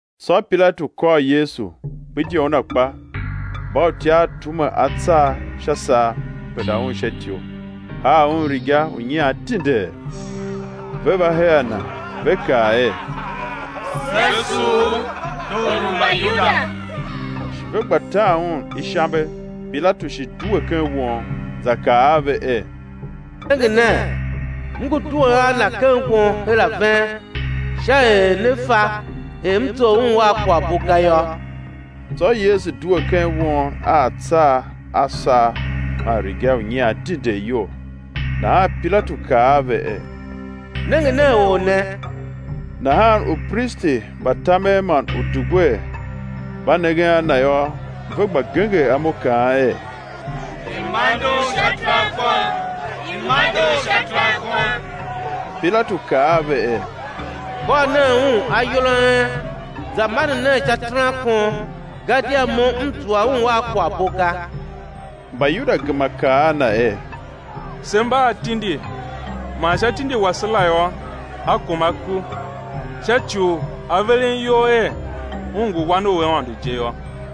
Tsô Pilatu kôr Yesu, gbidye Un akpa. Mbautyav tume atsar sha saa, penda Un sha ityou, haa Un riga u nyian dindee, ve va her a Na, ve kaa er: Se sugh U, Tor u Mbayuda. Shi ve gba tan Un ishambe. Pilatu shi due ken won, za kaa a ve er: Nenge nen, m ngu duen a Na ken won her a ven sha er ne fa er m zough Un a kwaghbo ga yô. Tsô Yesu due ken won a atsar a saa man riga u nyian dindee iyol. Nahan Pilatu kaa a ve er: Nenge nen or ne. Nahan upristi mba tamen man udugwer mba nengen a Na yô, ve gba genger imo kaan er: I̱ mande Un sha terankon, i̱ mande Un sha terankon. Pilatu kaa a ve er: Kôr nen Un ayol a en, za mande nen sha terankon, gadia mo m zua Un a kwaghbo ga. Mbayuda gema kaa a Na er: Se mba a tindi man sha tindi wase la yô, A kuma ku, sha ci u A veren iyol er Un ngu Wan u Aôndo je yô.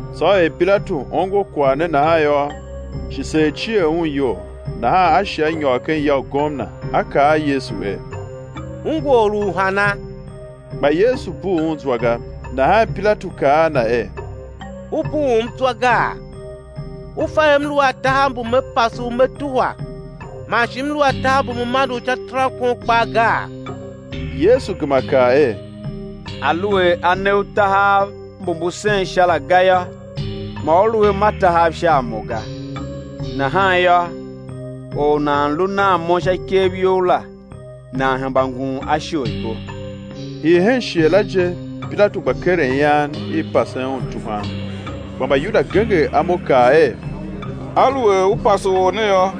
Tsô er Pilatu ongo kwagh ne nahan yô, shi seer cier un iyol, nahan a shi a nyôr ken ya u gomna, a kaa a Yesu er: U ngu Or u hana? Kpa Yesu bugh un zwa ga, Nahan Pilatu kaa a Na er: U bughum zwa gaa? U fa er m lu a tahav mbu me pase U me tuhwa, man shi m lu a tahav mbu me mande U sha terankon kpaa gaa? Yesu gema kaa er: Aluer a ne u tahav mbu mbu sen sha la ga yô, ma u lu a ma tahav sha a Mo ga; nahan yô, or u nan lu nan Mo sha ikev you la, nan hemba ngun a isholibo. Hii hen shighe la je Pilatu gba keren ian i pasen Un tuhwan, kpa Mbayuda genger imo, kaa er: Aluer u pase or ne yô,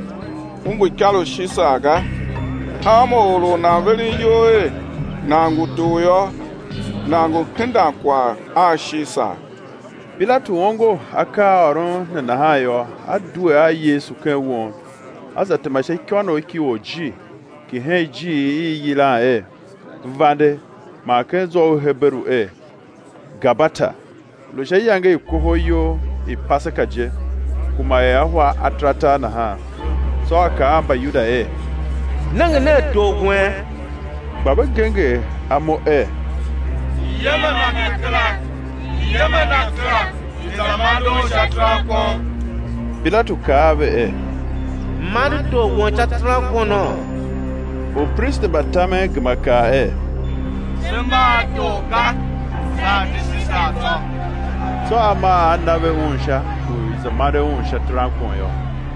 u ngu ikar u Shisar ga; hanma or u nan veren iyol er nan ngu tor yô, nan ngu hendan kwagh a Shisar. Pilatu ongo akaaôron ne nahan yô, a due a Yesu ken won, a za tema sha ikônough ki orjir ki hen ijiir i i yilan er, vande man ken zwa u Heberu er, Gabata. Lu sha iyange i kohol iyol i Paseka je, kuma er ahwa ataratar nahan; tsô a kaa a Mbayuda er: Nenge nen tor wen! Kpa ve genger imo er: I̱ yem a Na kera, i̱ yem a Na kera. I̱ za mande Un sha terankon. Pilatu kaa a ve er: M̱ mande Tor wen sha terankono? Upristi mba tamen gema kaa er: Se mba a tor ga, saa di Shisar tsô. Tsô a maa a na ve Un sha u i̱ za mande Un sha terankon yô.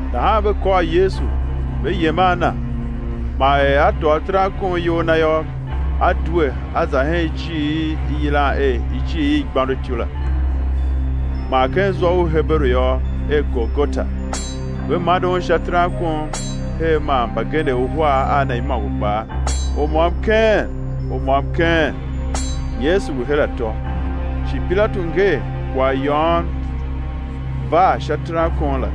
Nahan ve kôr Yesu, ve yem a Na. Man er A tôô terankon iyol Na yô, A due A za hen ijiir i i yilan er ijiir i igbôndotyou la, man ken zwa u Heberu yô, er Golgota. Ve mande Un sha terankon her man mbagenev uhar a Na imôngo kpaa; u môm keen u môm keen, Yesu lu her atô. Shi Pilatu nger kwaghyôôn var sha terankon la;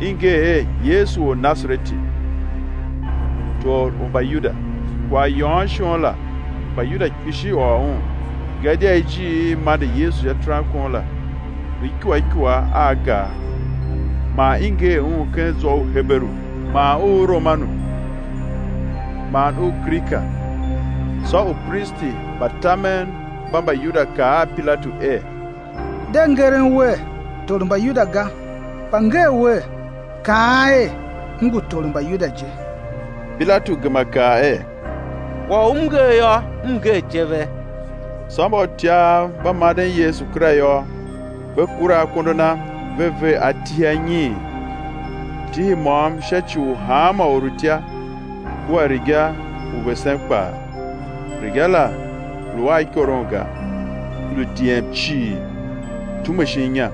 i nger er: Yesu Ornasareti, Tor u Mbayuda. Kwaghyôôn shon la Mbayuda kpishi ôr un; gadia ijiir i i mande Yesu sha terankon la, lu ikua ikua a gar; man i nger un ken zwa u Heberu, man u Romanu, man u Grika. Tsô upristi mba tamen mba Mbayuda kaa a Pilatu er: De ngeren wer: Tor u Mbayuda ga, kpa nger wer: Kaan er: M ngu Tor u Mbayuda je. Pilatu gema kaa er: Kwagh u m nger yô, m nger je ve. Tsô mbautyav mba manden Yesu kera yô, ve kura akondo Na, ve ver atihi anyiin, tihi môm sha ci u hanma orutya, kua riga u vesen kpaa. Riga la lu a ikoron ga, lu diem cii, tume shin inya.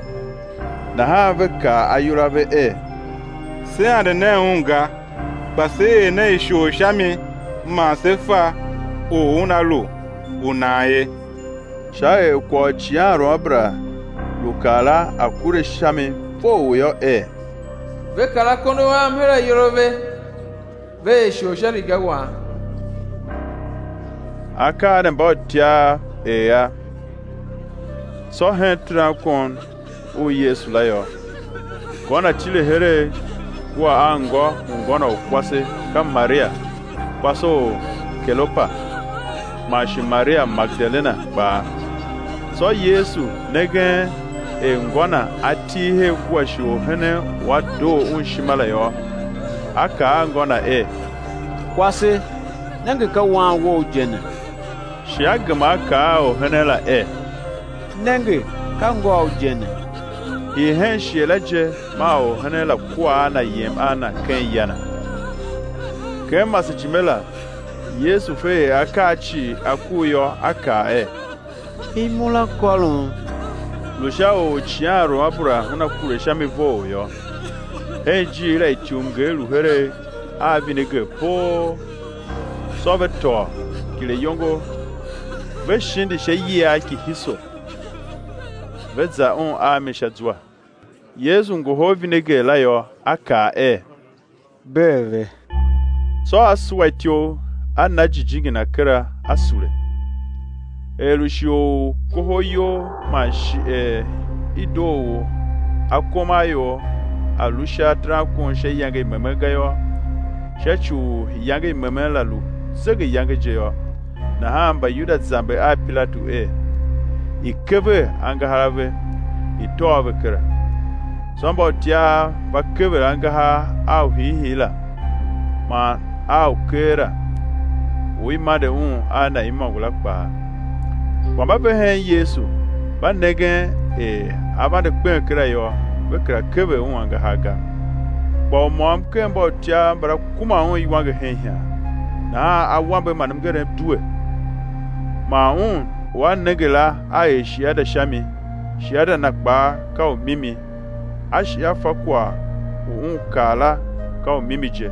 Nahan ve kaa ayol a ve er: Se ande nen un ga, kpa se er nen ishor sha mi, man sé fa or u una lu u nan ye; sha er kwagh u icighanruamabera lu kaa la, a̱ kure sha mi vough yô, er: Ve kar akondo Am her ayol a ve, ve er ishor sha riga Wam. Akaa ne mbautyav er a. Tsô hen terankon u Yesu la yô, ngô Na tile heregh kua anngô u ngô Na u kwase, ka Maria, kwase u Kelopa, man shi Maria Magedalena kpaa. Tsô Yesu nengen er ngô Na a til her kua shi orhenen u a doo Un ishima la yô, A kaa a ngô Na er: Kwase, nenge ka wan wou je ne. Shi A gema A kaa a orhenen la er: Nenge ka ngôu je ne. Hii hen shighe la je maa orhenen la kua a na yem a na ken ya na. Ken masejime la, Yesu fe er akaa cii a kur yô, A kaa er: Imura kôrom. Lu sha u icighanruamabera una kure sha mi vough yô. Hen ijiir la ityumnger lu heregh a vineger poo; tsô ve tôô kileyongo, ve shindi sha iyiagh ki hisop, ve za Un a mi sha zwa. Yesu ngohol vineger la yô, A kaa er: Bee ve. Tsô A suwa ityough, A na jijingi Na kera A sule. Er lu shighe u kohol iyol man shi er i doo u akomaior á lu sha terankon sha iyange i memen ga yô, sha ci u iyange i memen la lu zegeyange je yô, nahan Mbayuda zamber a Pilatu er i̱ kever angahar a ve, i̱ tôô ve kera. Tsô mbautyav va kever angahar a u hiihii la, man a u keela, u i mande un a Na imôngo la kpaa. Kpa mba ve hen Yesu, mba nengen er A vande kpen kera yô, ve kera kever Un angahar ga. Kpa u môm ken mbautyav mbala kuma Un iwange hen ihan; nahan awambe man mngerem due. Man un u a nenge la a er shiada sha mi, shiada na kpaa ka u mimi; a shi a fa kwagh u un kaa la ka u mimi je,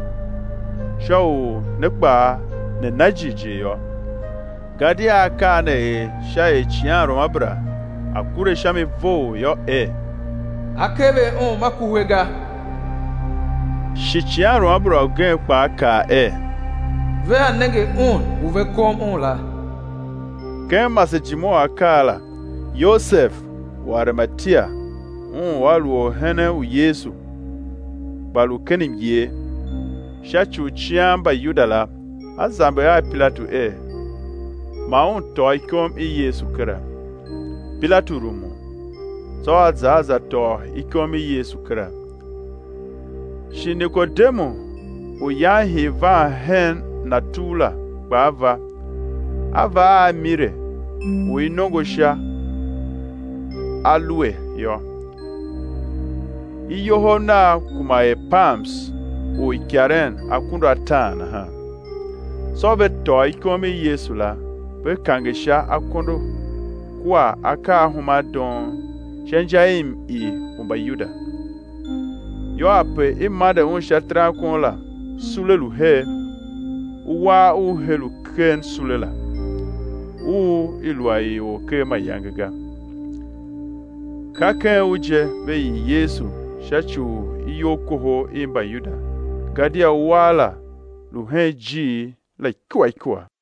sha u ne kpaa ne na jighjigh yô. Gadia akaa ne er sha er icighanruamabera a̱ kure sha mi vough yô, er: Á kever Un ma kuhe ga. Shi icighanruamabera ugen kpaa kaa er: Vea nenge Un u ve kom Un la. Ken masejime u akaa la, Yosev u Arimatia, un u a lu orhenen u Yesu, kpa lu ken myer, sha ci u cian Mbayuda la, a zamber a Pilatu er, ma un tôô ikom i Yesu kera, Pilatu rumun. Tsô a za a za tôô ikom i Yesu kera. Shi Nikodemu u yan hii van hen Na tugh la, kpaa va, a va a mire u i nongo sha alue yô, iyohov nav kuma er pams u ikaren akunduataan nahan. Tsô ve tôô ikom i Yesu la, ve kange sha akondo kua akaahumandoon sha inja i m-ii u Mbayuda. Yô, ape i mande Un sha terankon la, sule lu her; uwar u he lu ken sule la, u i lu a ii or ker mayange ga. Ka ken u je ve ii Yesu, sha ci u iyolkohol i Mbayuda gadia uwar la lu hen ijiir la ikua ikua.